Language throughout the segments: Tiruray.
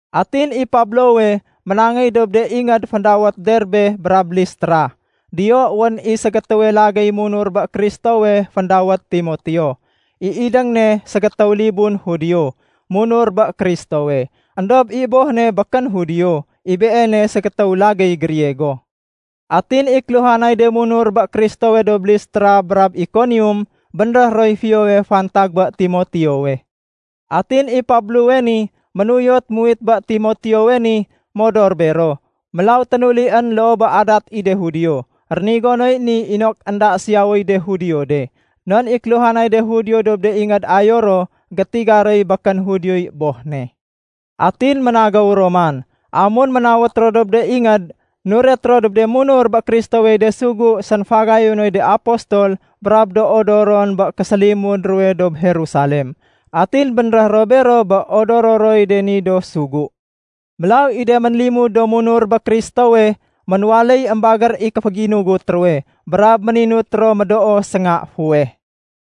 Atin i Pablowe ménangéy dob de ingéd féndawét Derbe brab Listra. Diyo wén i ségétéwe lagéy munur bé Kristowe féndawét Timoteo. I idéng ne ségétéw libun Judio, munur bé Kristowe. Endob i boh ne békén Judio, i beene ségétéw lagéy Griego. Atin i kéluhanay de munur bé Kristowe dob Listra brab Ikonium bénréh roy fiyowe fantag bé Timoteowe. Atin i Pablowe ni ménuyot muwit bé Timoteowe ni modor bero. Mélaw ténulién loo bé adat i de Judio. Rénigo noy ni inok énda siyawéy de Judio de, non i kéluhanay de Judio dob de ingéd ayo ro, gétiga roy békén Judioy boh ne. Atin ménagéw ro man. Amun ménawét ro dob de ingéd, nuret ro dob de munur bé Kristowey de sugu sénfagayunoy de apostol brab do odoron bé késélimud ruwe dob Jerusalem. Atin bénréh ro bero bé odoro roy de ni do sugu. Mélaw i de ménlimud do munur bé Kristowe ménwaléy émbagér i kéféginugut ruwe brab méninut ro médoo sénga fuweh.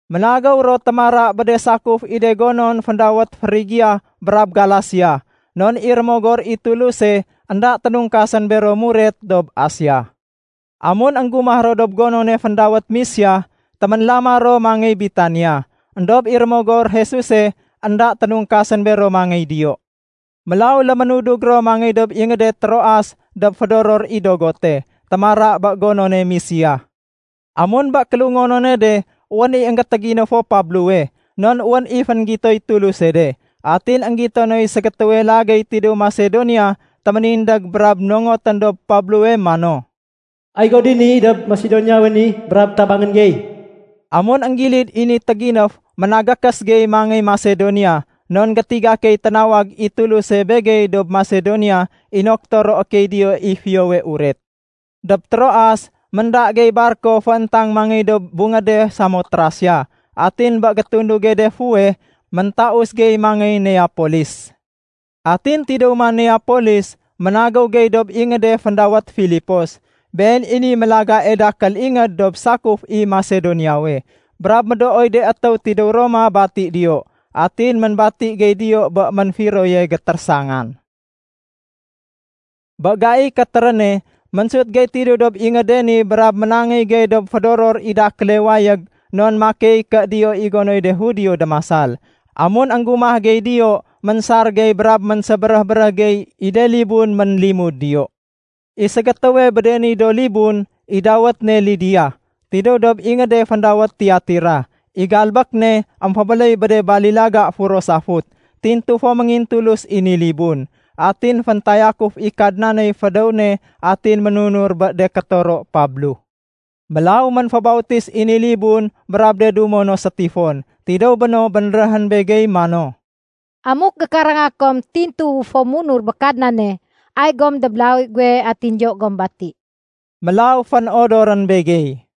Ménagéw ro témara bé de sakuf i de gonon féndawét Frigia brab Galasia, non i Rémogor i Tuluse énda ténungkasén bero muret dob Asia. Amun énggumah ro dob gonone féndawét Misia, téménlama ro mangéy Bitinia. Endob i Rémogor Jesuse énda ténungkasén bero mangéy diyo. Mélaw léménudug ro mangéy dob ingéde Troas dob fédoror i dogote, témara bé gonone Misia. Amun bé kélungonone de wén i énggétéginéfo Pablowe, non wén i fénggitoy Tuluse de. Atin énggito noy ségétéwe lagéy tidéw Masedonia téménindég brab nongotén dob Pablowe mano, “Ay go dini dob Masedoniawe ni brab tabangén gey.” Amun énggilid i ni téginéf, ménagékés gey mangéy Masedonia, non gétiga key ténawag i Tuluse begey dob Masedonia inok toroé key diyo i Fiyowe Uret. Dob Troas, ménda gey barko fééntang mangéy dob bungéde Samotrasia. Atin bé gétunduge de fuweh, méntaus gey mangéy Neapolis. Atin tidéw man Neapolis, ménagéw gey dob ingéde féndawét Filipos. Been i niy mélagae dakél ingéd dob sakuf i Masedoniawe. Brab médooy de étéw tidéw Roma bati diyo. Atin ménbati gey diyo bé ménfiroye gétérésangan. Bé gaiy kétéréne, ménsut gey tidéw dob ingéde ni brab ménangéy gey dob fédoror i dakéle wayég, non makey ké diyo i gonoy de Judio démasal. Amun énggumah gey diyo, ménsar gey brab ménsébéréh-béréh gey i de libun ménlimud diyo. I ségétéwe bé de ni do libun, i dawét ne Lidia, tidéw dob ingéde féndawét Tiatira. I galbék ne émfébéléy bé de balilaga furo safut. Tintu fo méngintulus i ni libun. Atin féntayakuf i Kadnaney fédéw ne atin ménunur bé de kétoro Pablo. Mélaw ménfébautis i ni libun brab de dumo no sétifon. Tidéw béno bénréhén begey mano, “Amuk gékaranga kom tintuwu fo munur bé Kadnane, ay gom dob lawi guwe atin diyo gom bati.” Mélaw fénodorén begey.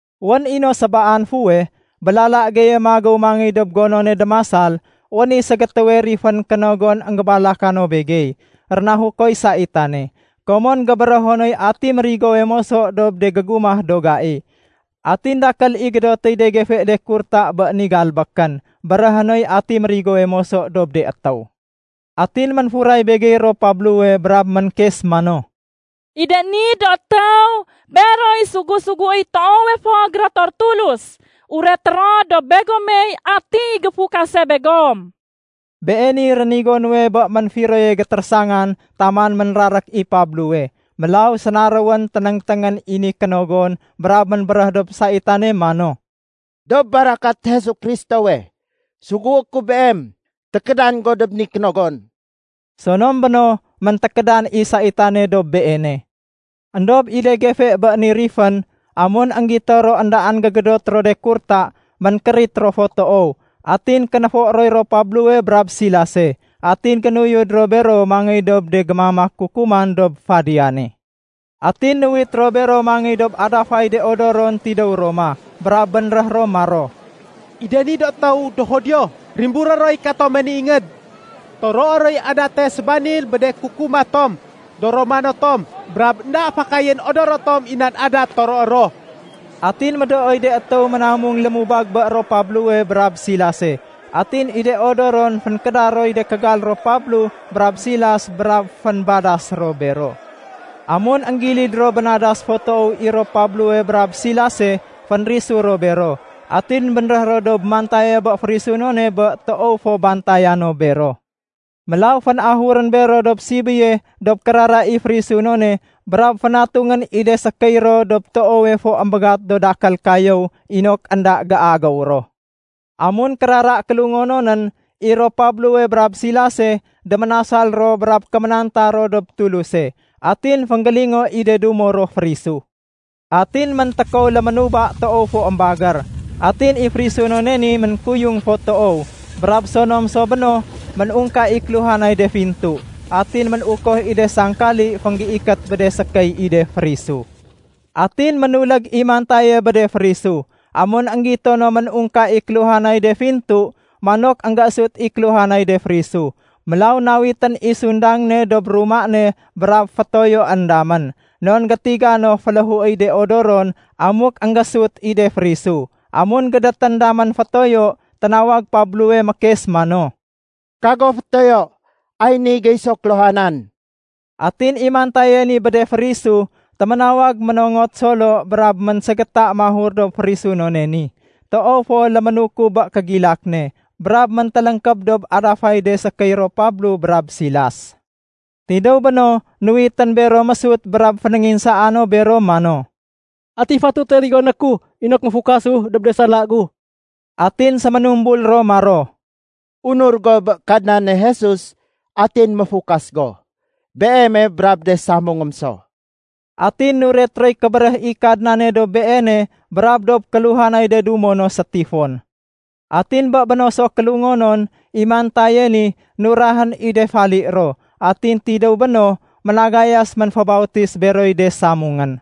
Wén i no sébaan fuweh, bé lala geye magéw mangéy dob gonone démasal, wén i ségétéwe rifén kénogon énggébalaka no begey. Rénahukoy saitane, komon gébérého noy ati mérigowe moso dob de gégumah do gai. Atin dakél i gédotéy de gefe de kurta bé ni galbékén béréhé noy ati mérigowe moso dob de étéw. Atin ménfuray begey ro Pablowe brab ménkes mano, “I de ni do étéw, beroy sugu-suguéy toowe fo gérotor Tulus. Ureté ro dob begomey atiy géfukase begom.” Beeniy rénigo nuwe bé ménfiroye gétérésangan taman ménrarék i Pablowe. Mélaw sénaréwén ténéngténgén i ni kénogon brab ménbéréh dob saitane mano, “Dob barakat Jesu Kristowe, sugué ku beem tékédan dob ni kénogon!” Sonom béno, méntékédan i saitane dob beene. Endob i de gefe bé ni rifén, amun énggito ro éndaén gégédot ro de kurta, ménkérit ro fo toow. Atin kénéfo roy ro Pablowe brab Silase, atin génuyud ro bero mangéy dob de gémamak kukuman dob fadiyane. Atin nuwit ro bero mangéy dob adafay de odoron tidéw Roma, brab bénréh ro maro, “I de ni do étéw, do Judio. Rimburé roy katome ni ingéd. Toroé roy adate sébanil bé de kukuma tom. Do Romano tom, brab énda fakayén odoro tom i nan adat toroé ro.” Atin médooy de étéw ménamung lémubag bé ro Pablowe brab Silase. Atin i de odoron fénkéda roy de kégal ro Pablo brab Silas brab fénbadas ro bero. Amun énggilid ro bénadas fo toow i ro Pablowe brab Silase, fénrisu ro bero, atin bénréh ro dob mantaye bé férisunone bé toow fo bantaya no bero. Mélaw fénahurén bero dob sibéye dob kérara i férisunone brab fénatungén i de sékéy ro dob toowe fo émbégat do dakél kayéw inok énda géagéw ro. Amun kérara kélungononén, i ro Pablowe brab Silase déménasal ro brab kéménanta ro dob Tuluse. Atin fénggélingo i de dumo ro férisu. Atin méntékow léménuba toow fo émbagér, atin i férisunone ni ménkuyung fo toow. Brab sonom so béno, ménungka i kéluhanay de fintu. Atin ménukoh i de sangkali fénggéikét bé de sékéy i de férisu. Atin ménulég i mantaye bé de férisu. Amun énggito no ménungka i kéluhanay de fintu, manok énggésut i kéluhanay de férisu. Mélaw nawitén i sundang ne dob ruma ne brab fétoyoén damén, non gétiga no féléhuéy de odoron amuk énggésut i de férisu. Amun gédétén damén fétoyo, ténawag Pablowe mékes mano, “Kago fétoyo, ay ni gey so kéluhanan!” Atin i mantaye ni bé de férisu, téménawag ménongot solo brab ménségéta mahur dob férisunone ni. Toow fo léménukub bé kégilak ne, brab méntéléngkéb dob adafay de sékéy ro Pablo brab Silas. Tidéw béno, nuwitén bero mésut brab fénénginsaa no bero mano, “Ati fatute rigoné ku inok méfukasu dob de sala gu?” Atin séménumbul ro maro, “Unur go bé Kadnane Jesus atin méfukas go. Beeme brab de samungém so.” Atin nuret roy kébéréh i Kadnane dob beene brab dob kéluhanay de dumo no sétifon. Atin bé béno so kélungonon, i mantaye ni nurahén i de fali ro. Atin tidéw béno, ménagayas ménfébautis beroy de samungén.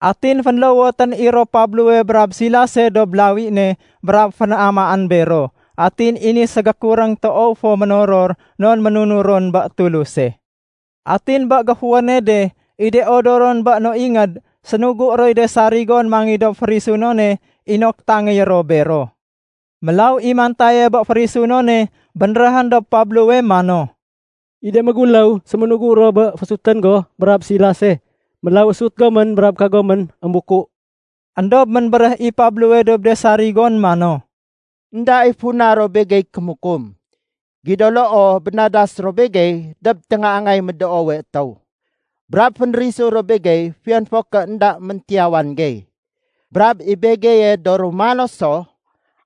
Atin fénlowotén i ro Pablowe brab Silase dob lawi ne brab fénamaén bero. Atin i ni ségékuréng toow fo ménoror non ménunur ron bé Tuluse. Atin bé géfuwéne de, i de odoron bé no ingéd, sénugu roy de sarigon mangéy dob férisunone inok tangéyé ro bero. Mélaw i mantaye bé férisunone bénréhén dob Pablowe mano, “I de méguléw séménugu ro bé féésutén go brab Silase. Mélaw ésut gomén brab kagomén émbuku.” Endob ménbéréh i Pablowe dob de sarigon mano, “Enda i funa ro begey kémukum. Gido loo bénadas ro begey dob téngaangay médoowe étéw, brab fénrisu ro begey fiyon fo ké énda méntiyawan gey. Brab i begeye do Romano so!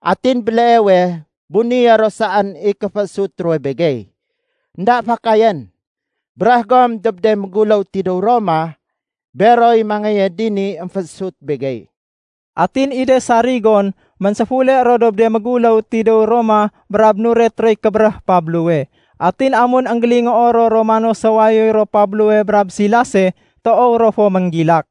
Atin béleewe bunéyé ro saén i kéféésut ruwe begey! Enda fakayén! Béréh gom dob de méguléw tidéw Roma, beroy mangéye dini émféésut begey.” Atin i de sarigon ménséfule ro dob de méguléw tidéw Roma brab nuret roy kébéréh Pablowe. Atin amun énggélingoo ro Romano so wayoy ro Pablowe brab Silase, toow ro fo ménggilak.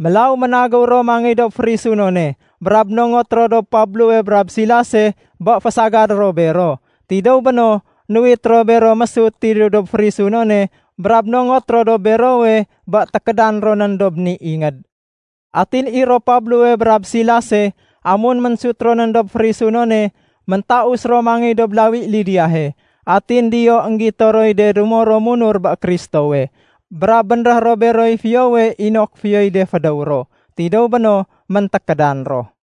Mélaw ménagéw ro mangéy dob férisunone brab nongot ro dob Pablowe brab Silase bé fésagadé ro bero. Tidéw béno, nuwit ro bero mésut tidéw dob férisunone brab nongot ro dob berowe bé tékédan ronén dob ni ingéd. Atin i ro Pablowe brab Silase, amun ménsut ronén dob férisunone, méntaus ro mangéy dob lawi Lidiahe. Atin diyo énggito roy de dumo ro munur bé Kristowe. Brab bénréh ro beroy fiyowe inok fiyoy de fédéw ro. Tidéw béno méntékédan ro.